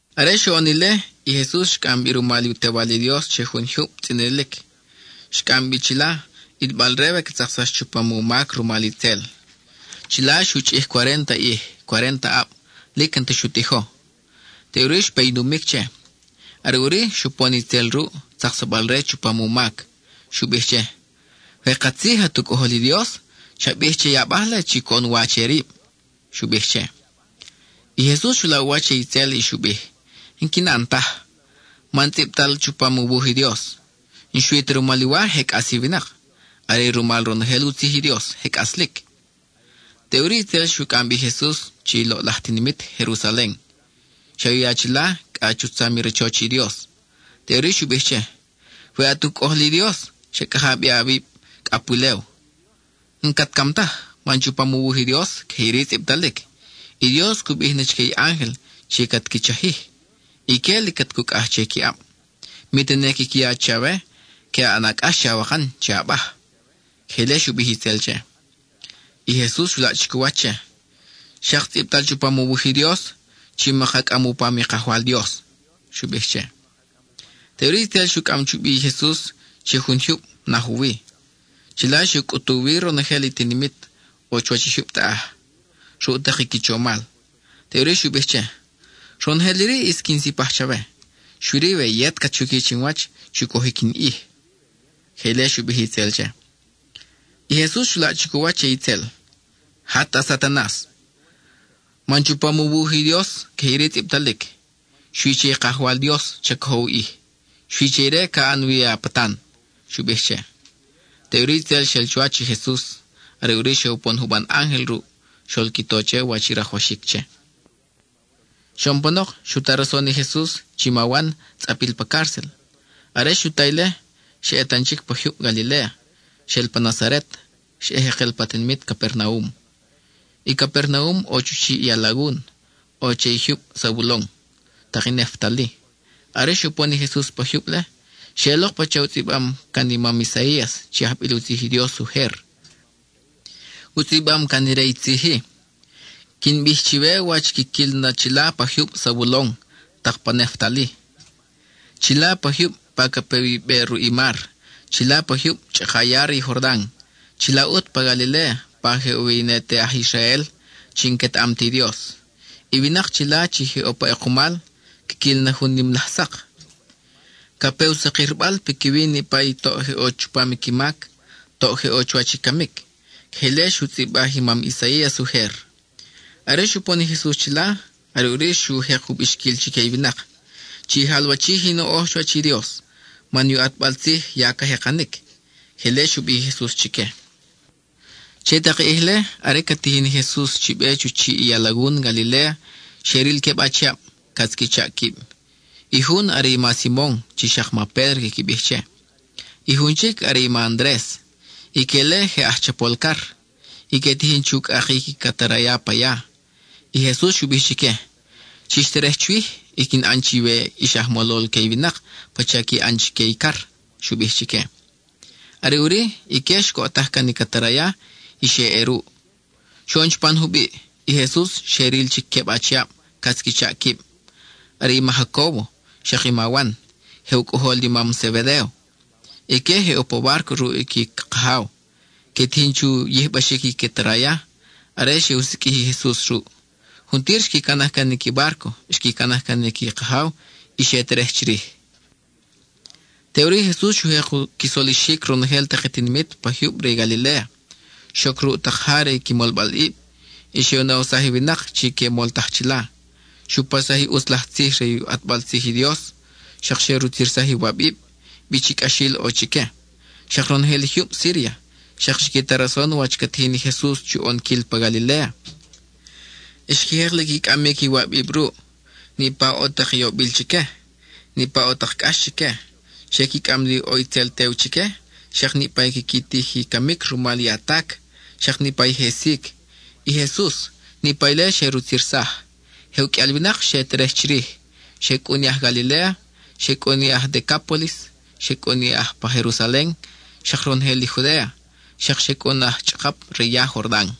Are xoʼon ile, i Jesus xcʼam bi rumal i u Tewal i Dios che jun jyub tzʼinilic. Xcʼam bi chila, ʼilbal-re we ca tzaksax chupam u mac rumal itzel. Chila xu chʼij cuarénta ʼij, cuarénta aʼab, lic n-ta xu tijo; teʼuri xpe i numic che. Are ʼuri, xupon itzel ruʼ, tzaksabal-re chupam u mac. Xu bij che: —We katzij at u Cʼojol i Dios, cha bij che i abaj-le chi coʼon wa che rib —xu bij che. I Jesus xu laʼ u wach che itzel y xu bij: —N-quin ʼan taj, man tzʼibtalic chupam u wuj i Dios: “N-xui ta rumal i wa je cʼas i winak; are rumal ronojel u tzij i Dios je cʼaslic.” Teʼuri itzel xu cʼam bi i Jesus che i loʼlaj tinimit, Jerusalen. Xe u ya chila cʼa chu tzam i rachoch i Dios. Teʼuri xu bij che: —We at u Cʼojol i Dios, cha cʼaka bi awib cʼa pulew. N-cat cam taj, man chupam u wuj i Dios, queje iri tzʼibtalic: I Dios cu bij na chique i ángel chi cat qui chajij. Ique lic cat cucʼaj che qui ʼab, mi tene quiqui ya chawe que ʼana cʼax che awakan che abaj. (Queje ile xu bij itzel che.) I Jesus xu laʼ chic u wach che: —Xak tzʼibtal chupam u wuj i Dios chi maka cʼam u pam i Kajwal Dios —xu bij che. Teʼuri itzel xu cʼam chubi i Jesus che jun jyub, naj u wi. Chila xe u cʼutu wi ronojel i tinimit ʼo chuwach i jyub taʼaj, ruʼ tak i qui chomal. Teʼuri xu bij che: —Ronojel iri ʼis quin sipaj chawe, xui-ri we yet cat xuqui chinwach chu cojic in ʼij. (Queje ile xu bij itzel che.) I Jesus xu laʼ chic u wach che itzel: —¡Jat, at Satanas! Man chupam u wuj i Dios, queje iri tzʼibtalic: “Xui che i Kajwal Dios cha cojo u ʼij; xui che ire ca ʼan wi a patan,” —xu bij che. Teʼuri itzel xel chuwach i Jesus; are ʼuri xe upon juban ángel ruʼ, xol qui to wach i rajwaxic che. Xoʼon panok, xu ta rason i Jesus chi ma wan tzʼapil pa cárcel. Are xu ta ile, xa ʼe tan chic pa jyub Galiléa, xel pa Nazaret, xa ʼe jekel pa tinimit Capernaum. I Capernaum ʼo chu chiʼ i alagun; ʼo che i jyub Zabulon, tak i Neftali. Are xupon i Jesus pa jyub-le, xeʼelok pacha u tzʼibam can i mam Isaías chi ajbil u tzij i Dios ujer. U tzʼibam can ire i tzij-i: Quin bij chiwe wach quiquil na chila pa jyub Zabulon tak pa Neftali, chila pa jyub pa ca ʼe wi i be ruʼ i mar, chila pa jyub chʼaka ya re i Jordan, chila ʼut pa Galiléa, pa je ʼo wi i ne te aj Israel, chi n-quetaʼam ti Dios. I winak chila chi je ʼo pa ʼekumal, quiquil na jun nim laj sak. Ca pe u sakirbal piquiwi niʼpa i toʼ je ʼo chupam qui mac, toʼ je ʼo chuwach i camic. (Queje ile xu tzʼibaj i mam Isaías ujer.) Are xupon i Jesus chila, are ʼuri xu jek u bixquil chique i winak: —Chi jalwachij i noʼoj chuwach i Dios, man i u ʼatbal tzij ya ca jekanic. (Queje ile xu bij i Jesus chique.) Che tak i ʼij-le, are ca tijin i Jesus chi be chu chiʼ i alagun Galiléa, xe ril queb achiab, catz qui chaʼ quib. I jun are i ma Simon chi xak ma Pédro quiqui bij che; i jun chic are i ma Andres. Ique-le je aj chapol car, y que tijin chu cʼakic i cataraya pa ya. I Jesus xu bij chique: —Chix terej chwij y quin ʼan na chiwe ix aj molol que i winak pacha qui ʼan chique i car —xu bij chique. Are ʼuri, ique xcoʼtaj can i cataraya, y xe ʼe ruʼ. Xoʼon chupan jubiʼ, i Jesus xe ril chic queb achiab catz qui chaʼ quib. Are i ma Jacóbo, xak i ma Wan, je u cʼojol i mam Zebedéo. Ique je ʼo pa bárco ruʼ i qui kajaw, que tijin chu yijbaxic i cataraya are xe u siqʼuij i Jesus ruʼ; juntir xqui canaj can i qui bárco, xqui canaj can i qui kajaw, y xe terej chirij. Teʼuri i Jesus xu jek qui solixic ronojel tak i tinimit pa jyub re i Galiléa. Xoc ruʼ tak ja re qui molbalʼib, y xe u nawsaj i winak chi que moltaj chila. Xu paxsaj i ʼutz laj tzij re u ʼatbal tzij i Dios, xak xe rutzirsaj iwabib, bi chi cʼaxil ʼo chique. Xak ronojel i jyub Síria xak xqui ta rason wach ca tijin i Jesus chu ʼonquil pa Galiléa. Xqui jek li qui cʼamic iwabib ruʼ: niʼpa ʼo tak i yobil chique, niʼpa ʼo tak cʼax chique. Xe qui cʼam li ʼo itzel tew chique, xak niʼpa i quiqui tij i camic rumal i atac, xak niʼpa i je sic. I Jesus, niʼpa ile xe rutzirsaj. Je uqʼuial winak xe terej chirij: xe cʼun i aj Galiléa, xe cʼun i aj Decápolis, xe cʼun i aj pa Jerusalen, xak ronojel i Judéa, xak xe cʼun aj chʼakap re i ya Jordan.